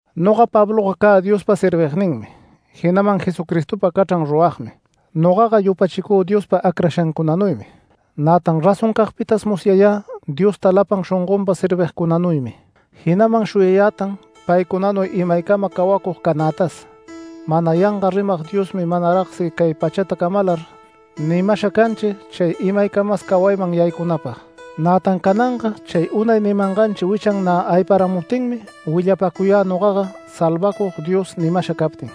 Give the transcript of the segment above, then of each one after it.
Noga Pabloga cä Diospa servigninmi, jinaman Jesucristopa cachran ruragmi. Nogaga yupachicü Diospa acrashancunanuymi, nätan razoncagpitas musyayä Diosta lapan shongonpa servigcunanuymi. Jinaman shuyayätan paycunanuy imaycama cawacug canätas. Mana yanga rimag Diosmi manaragsi cay pachata camalar nimasha canchi chay imaycamas cawayman yaycunapag. Nätan cananga chay unay nimanganchi wichan nä ayparamuptinmi willapacuyä nogaga, Salvacug Dios nimasha captin.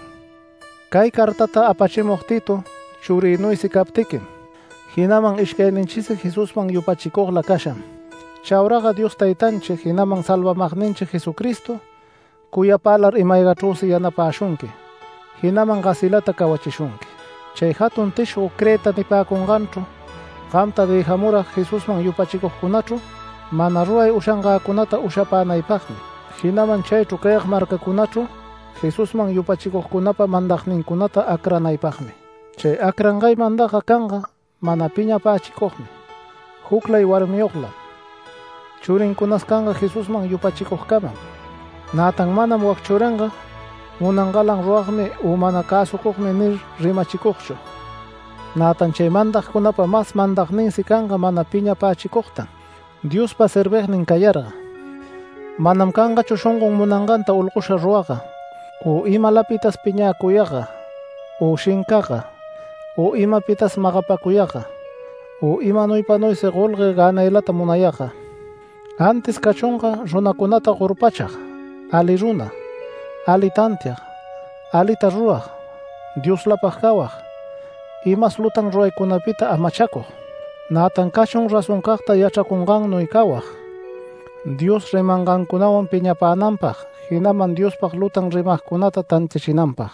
Cay cartata apachimug Tito, churïnuysi captiquim jinaman ishcayninchisi Jesusman yupachicugla casham. Chauraga Dios Taytanchi jinaman salvamagninchi Jesucristo cuyapälar ima-aygachrüsi yanapäshunqui, jinaman gasilata cawachishunqui. Chay jatun tishgo Creta nipäcunganchru gamta dëjamurag Jesusman yupachicugcunachru mana ruray ushangäcunata ushapänaypagmi, jinaman chaychru cayag marcacunachru Jesusman yupachicugcunapa mandagnincunata acranaypagmi. Chay acrangay mandagga canga mana piñapächicugmi, juclay warmiyoglam. Churincunas canga Jesusman yupachicugcamam, nätan manam “Wac churinga munangalan ruragmi u mana cäsucugmi” nir rimachicugchu. Nätan chay mandagcunapa mas mandagninsi canga mana piñapächicugtan Diospa servignin cayarga. Manam cangachu shongon munanganta olgosha ruragga u imalapitas piñäcuyagga u shincagga u imapitas magapäcuyagga, u imanuypanuysi golgue gänaylata munayagga. Antis cachunga runacunata gorpachag, ali runa, ali tantiag, alita rurag, Dioslapag cawag, imas lutan ruraycunapita amachacug. Nätan cachun razoncagta yachracungannuy cawag, Dios rimangancunawan piñapänanpag, jinaman Diospag lutan rimagcunata tantiachinanpag.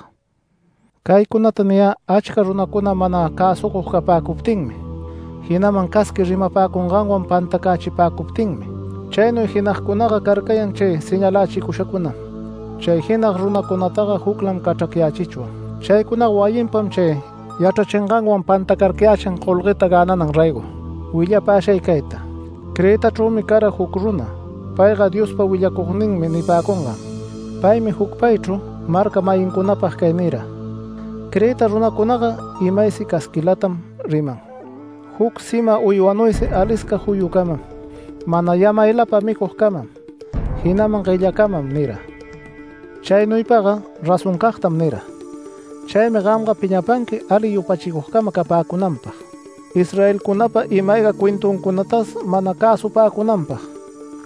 Caycunata niyä achca runacuna mana cäsucug capäcuptinmi, jinaman casqui rimapäcunganwan pantacächipacuptinmi. Chaynuy jinagcunaga carcayan, chay señalächicushacunam. Chay jinag runacunataga juclam cachracyächichwan. Chaycunaga wayinpam chay yachrachinganwan pantacarcayächin golgueta gänanan raygo. Willapäshay cayta: Cretachrümi cara juc runa payga “Diospa willacugninmi” nipäcungan. Paymi jucpaychru marca-mayincunapag cay nira: “Creta runacunaga imaysi casquilatam riman, juc sima uywanuysi alisca juyucamam, mana yamaylapa micugcamam, jinaman guellacamam” nira. Chaynuypaga razoncagtam nira. Chaymi gamga piñapanqui ali yupachicugcama capäcunanpag, Israelcunapa ima-ayga cuentuncunatas mana cäsupäcunanpag,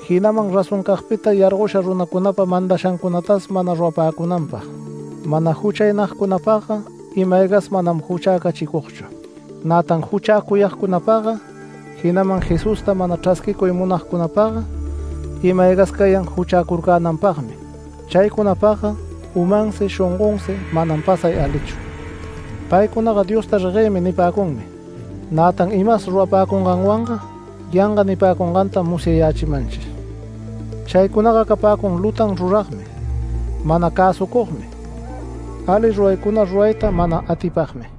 jinaman razoncagpita yargosha runacunapa mandashancunatas mana rurapäcunanpag. Mana juchaynagcunapagga ima-aygas manam juchäcachicugchu, nätan juchäcuyagcunapagga, jinaman Jesusta mana chrasquicuy munagcunapagga ima-aygas cayan juchäcurcänanpagmi. Chaycunapagga umansi, shongonsi manam pasay alichu. Paycunaga “Diosta reguëmi” nipäcunmi, nätan imas rurapäcunganwanga yanga nipäcungantam musyayächimanchi. Chaycunaga capäcun lutan ruragmi, mana cäsucugmi, ali ruraycuna rurayta mana atipagmi.